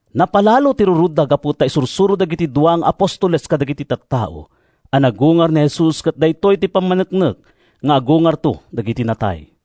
Napalalo ti rurodda gapu ta isursuro dagiti dua nga apostoles kadagiti tattao a nagungar ni Jesus ket daytoy ti pammaneknek nga agungarto dagiti natay.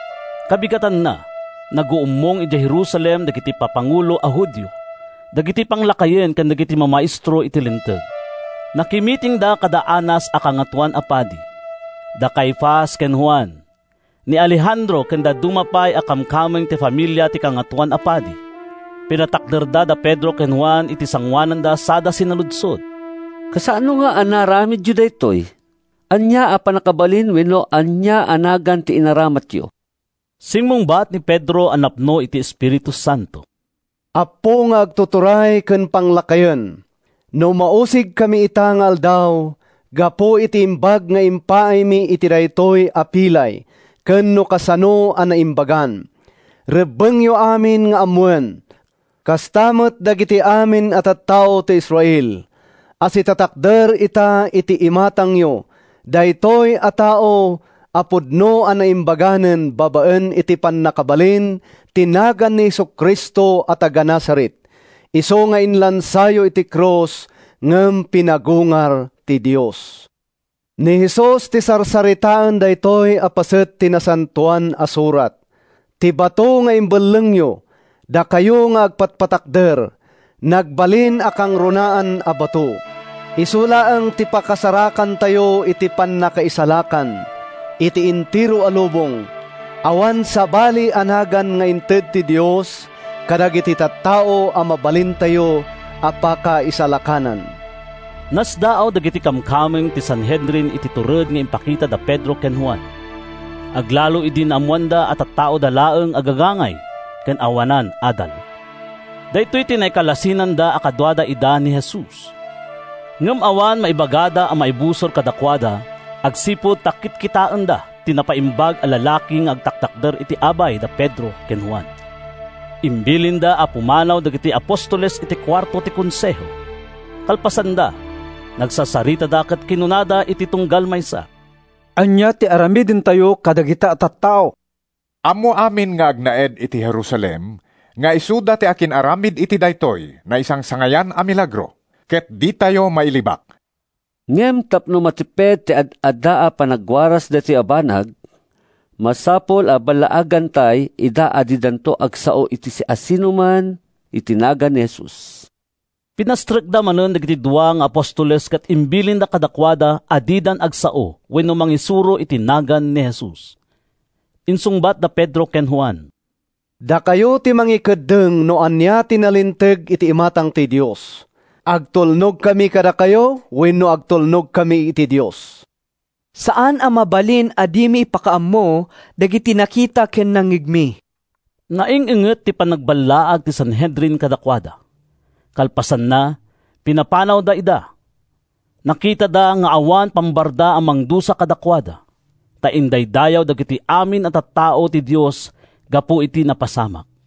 Kabigatanna, naguummong idiay Jerusalem dagiti papangulo a Judio, dagiti panglakayen ken dagiti mamaestro iti Linteg. Nakimitingda kada Anas a Kangatoan a Padi, da Caifas ken Juan, ni Alejandro ken dadduma pay a kamkameng ti familia ti Kangatoan a Padi. Pinatakderda da Pedro ken Juan iti sangoananda sada sinaludsod, “Kasano a naaramidyo daytoy? Ania a pannakabalin wenno ania a nagan ti inaramatyo?” Simmungbat ni Pedro a napno iti Espiritu Santo: “Appo nga agtuturay ken panglakayen, no mausigkami ita nga aldaw gapu iti imbag nga impaaymi iti daytoy a pilay ken no kasano a naimbagan, rebbengyo amin nga ammoen, kasta met dagiti amin a tattao iti Israel, a sitatakder ita iti imatangyo daytoy a tao a pudno a naimbaganen babaen iti pannakabalin ti nagan ni Jesu-Cristo a taga-Nazaret—isu nga inlansayo iti krus ngem pinagungar ti Dios. Ni Jesus ti sarsaritaen daytoy a paset ti Nasantoan a Surat: ‘Ti bato nga imbellengyo, dakayo nga agpatpatakder, Nagbalin a kangrunaan a bato.’ Isu laeng ti pakasarakantayo iti pannakaisalakan. Iti entero a lubong, awan sabali a nagan nga inted ti Dios kadagiti tattao a mabalintayo a pakaisalakanan.” Nasdaaw dagiti kamkameng ti Sanhedrin iti tured nga impakita da Pedro ken Juan, aglalo idi naammoanda a tattaoda laeng a gagangay ken awanan adal. Daytoy ti nakailasinanda a kadua ida idi ni Jesus. Ngem awan maibagada a maibusor kadakuada agsipud ta kitkitaenda ti napaimbag a lalaki nga agtatakder iti abay da Pedro ken Juan. Imbilinda a pumanaw dagiti apostoles iti kuarto ti Konseho. Kalpasanda, nagsasaritada ket kinunada iti tunggal maysa, “Ania ti aramidentayo kadagita a tattao? Ammo amin nga agnaed iti Jerusalem nga isuda ti akin-aramid iti daytoy naisangsangayan a milagro, ket ditayo mailibak. Ngem tapno matiped ti ad-adda a panagwaras daytoy a banag, masapul a ballaagantay ida a didan agsao iti siasinoman iti nagan ni Jesus.” Pinastrekda manen dagiti dua nga apostoles ket imbilinda kadakuada a didan agsao wenno mangisuro iti nagan ni Jesus. Insungbat da Pedro ken Juan, “Dakayo ti mangikeddeng no ania ti nalinteg iti imatang ti Dios: agtulnogkami kadakayo wenno agtulnogkami iti Dios? Saan a mabalin a dimi ipakaammo dagiti nakita ken nangngegmi.” Naing-inget ti panangballaag ti Sanhedrin kadakuada. Kalpasanna, pinapanawda ida. Nakitada nga awan pambaranda a mangdusa kadakuada, ta indaydayaw dagiti amin a tattao ti Dios gapu iti napasamak.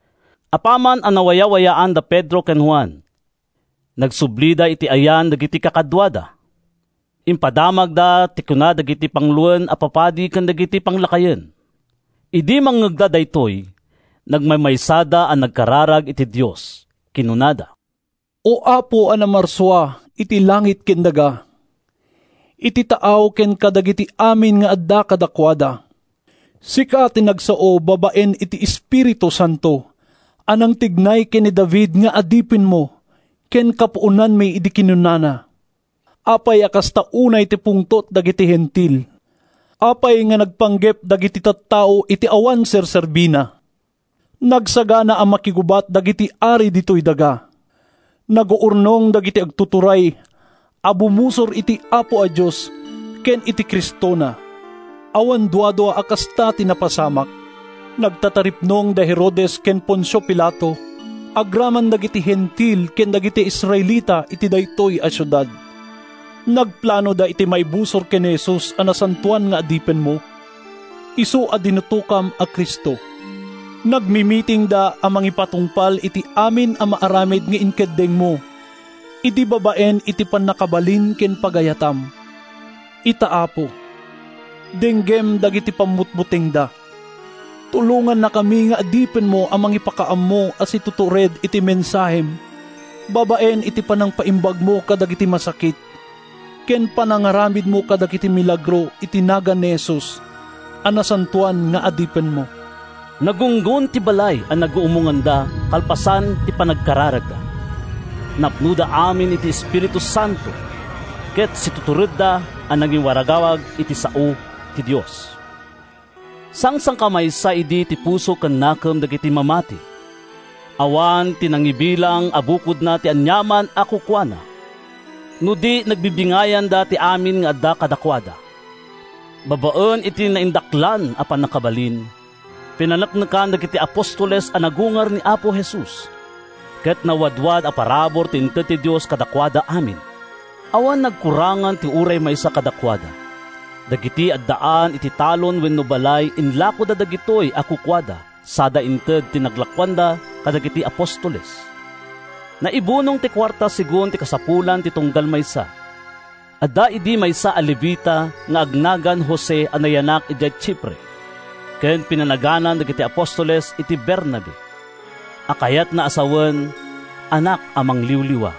Apaman a nawayawayaan da Pedro ken Juan, nagsublida iti ayan dagiti kakaduada. Impadamagda ti kinuna dagiti panguloen a papadi ken dagiti panglakayen. Idi mangngegda daytoy, nagmaymaysada a nagkararag iti Dios. Kinunada, “O Apo a Namarsua iti langit ken daga, iti taaw ken kadagiti amin nga adda kadakuada! Sika ti nagsao babaen iti Espiritu Santo a nangtignay ken ni David nga adipenmo ken kapuonanmi idi kinunana: ‘Apay a kasta unay ti pungtot dagiti Hentil? Apay a nagpanggep dagiti tattao iti awan serserbina? Nagsagana a makigubat dagiti ari ditoy daga, Naguurnong dagiti agtuturay A bumusor iti Apo a Dios ken iti Cristona.’ Awan duadua a kasta ti napasamak: nagtataripnong da Herodes ken Poncio Pilato, agraman dagiti Hentil ken dagiti Israelita iti daytoy a siudad. Nagplanoda iti maibusor ken ni Jesus a nasantoan nga Adipenmo, isu a dinutokam a Cristo. Nagmimitingda a mangipatungpal iti amin a maaramid nga inkeddengmo idin babaen iti pannakabalin ken pagayatam. Ita, Apo, denggem dagiti pammutbutengda. Tulongannakami nga adipenmo a mangipakaammo a situtured iti mensahem babaen iti panangpaimbagmo kadagiti masakit ken panangaramidmo kadagiti milagro iti nagan ni Jesus a nasantoan nga Adipenmo.” Nagunggon ti balay a naguummonganda kalpasan ti panagkararagda. Napnoda amin iti Espiritu Santo, ket situturedda a nangiwaragawag iti sao ti Dios. Sangsangkamaysa idi ti puso ken nakem dagiti mamati. Awan ti nangibilang a bukodna ti aniaman a kukuana, no di nagbibingayanda ti amin nga adda kadakuada. Babaen iti naindaklan a pannakabalin, pinaneknekan dagiti apostoles a nagungar ni Apo Jesus. Ket nawadwad a parabur ti inted ti Dios kadakuada amin. Awan nagkurangan ti uray maysa kadakuada. Dagiti addaan iti talon wenno balay inlakoda dagitoy a kukuada sada inted ti naglakoanda kadagiti apostoles. Naibunong ti kuarta segun ti kasapulan ti tunggal maysa. Adda idi maysa a Levita nga agnagan Jose a nayanak idiay Chipre ken pinanaganan dagiti apostoles iti Bernabe (a kayatna a sawen, “Anak a Mangliwliwa”).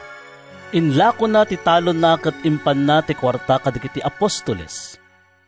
Inlakona ti talonna ket impanna ti kuarta kadagiti apostoles.